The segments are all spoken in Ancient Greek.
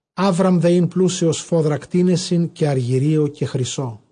Ἅβραμ δὲ ἦν πλούσιος σφόδρα κτήνεσι, καὶ ἀργυρίῳ, καὶ χρυσίῳ.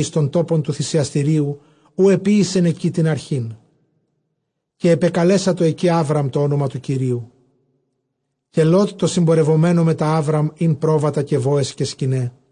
εἰς τὸν τόπον τοῦ θυσιαστηρίου, οὗ ἐποίησεν ἐκεῖ τὴν ἀρχὴν, καὶ ἐπεκαλέσατο ἐκεῖ Ἅβραμ τὸ ὄνομα τοῦ Κυρίου. Καὶ Λὼτ τῷ συμπορευομένῳ μετὰ Ἅβραμ ἦν πρόβατα, καὶ βόες, καὶ σκηναί.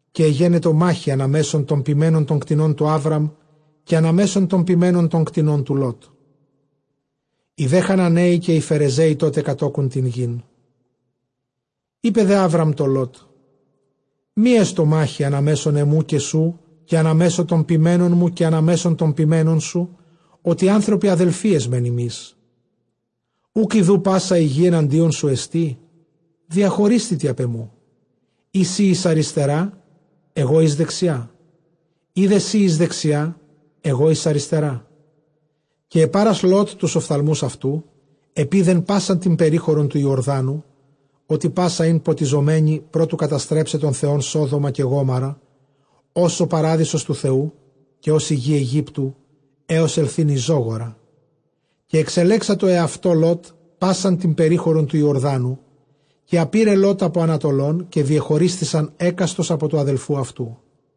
Καὶ ἐγενετο μάχη ἀνὰ μέσον τῶν ποιμένων τῶν κτηνῶν τοῦ Ἅβραμ, καὶ ἀνὰ μέσον τῶν ποιμένων τῶν κτηνῶν τοῦ Λώτ· οἱ δὲ Χαναναῖοι καὶ οἱ Φερεζαῖοι τότε κατῴκουν τὴν γῆν. Εἶπε δὲ Ἅβραμ τῷ Λὼτ, μὴ ἔστω μάχη ἀνὰ μέσον ἐμοῦ καὶ σοῦ, καὶ ἀνὰ μέσον τῶν ποιμένων μου καὶ ἀνὰ μέσον τῶν ποιμένων σοῦ, ὅτι ἄνθρωποι ἀδελφοὶ ἐσμὲν ἡμεῖς. Οὐκ ἰδοὺ πᾶσα ἡ γῆ ἐναντίον σου ἐστί; διαχωρίσθητι ἀπʼ ἐμοῦ· εἰ σὺ εἰς ἀριστερὰ, ἐγὼ εἰς δεξιά· εἰ δὲ σὺ εἰς δεξιὰ, ἐγὼ εἰς ἀριστερά. Καὶ ἐπάρας Λὼτ τοὺς ὀφθαλμοὺς αὐτοῦ, ἐπεῖδε πᾶσαν τὴν περίχωρον τοῦ Ἰορδάνου, ὅτι πᾶσα ἦν ποτιζομένη, πρὸ τοῦ καταστρέψαι τὸν Θεὸν Σόδομα καὶ Γόμοῤῥα, ὡς ὁ παράδεισος τοῦ Θεοῦ, καὶ ὡς ἡ γῆ Αἰγύπτου, ἕως ἐλθεῖν εἰς Ζόγορα. Καὶ ἐξελέξατο ἑαυτῷ Λὼτ πᾶσαν τὴν περίχωρον τοῦ Ἰορδάνου· καὶ ἀπῇρε Λὼτ ἀπὸ ἀνατολῶν· καὶ διεχωρίσθησαν ἕκαστος ἀπὸ τοῦ ἀδελφοῦ αὐτοῦ.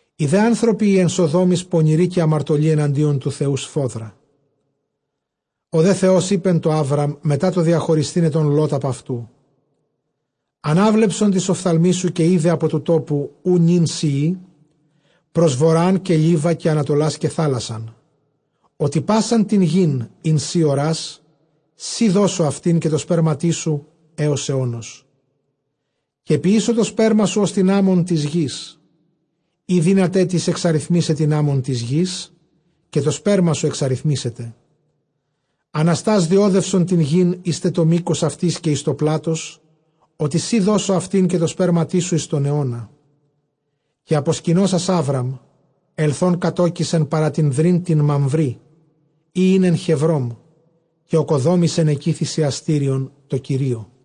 Οἱ δὲ ἄνθρωποι οἱ ἐν Σοδόμοις πονηροὶ καὶ ἁμαρτωλοὶ ἐναντίον τοῦ Θεοῦ σφόδρα. Ὁ δὲ Θεὸς εἶπε τῷ Ἅβραμ μετὰ τὸ διαχωρισθῆναι τὸν Λὼτ ἀπʼ αὐτοῦ, ἀνάβλεψον τοῖς ὀφθαλμοῖς σου, καὶ ἴδε ἀπὸ τοῦ τόπου οὗ νῦν σὺ εἶ πρὸς βοῤῥὰν καὶ λίβα καὶ ἀνατολὰς καὶ θάλασσαν· ὅτι πᾶσαν τὴν γῆν, ἣν σὺ ὁρᾷς, σοὶ δώσω αὐτὴν καὶ τῷ σπέρματί σου ἕως αἰῶνος. Καὶ ποιήσω τὸ σπέρμα σου, ὡς τὴν ἄμμον τῆς γῆς· εἰ δύναταί τις ἐξαριθμῆσαι τὴν ἄμμον τῆς γῆς, καὶ τὸ σπέρμα σου ἐξαριθμηθήσεται. Ἀναστὰς διόδευσον τὴν γῆν εἴς τε τὸ μῆκος αὐτῆς καὶ εἰς τὸ πλάτος· ὅτι σοι δώσω αὐτὴν καὶ τῷ σπέρματί σου εἰς τὸν αἰῶνα. Καὶ ἀποσκηνώσας Ἅβραμ, ἐλθὼν κατῴκησε παρὰ τὴν δρῦν τὴν Μαμβρῆ, ἣ ἦν ἐν Χεβρὼμ, καὶ ᾠκοδόμησεν ἐκεῖ θυσιαστήριον τῷ Κυρίῳ.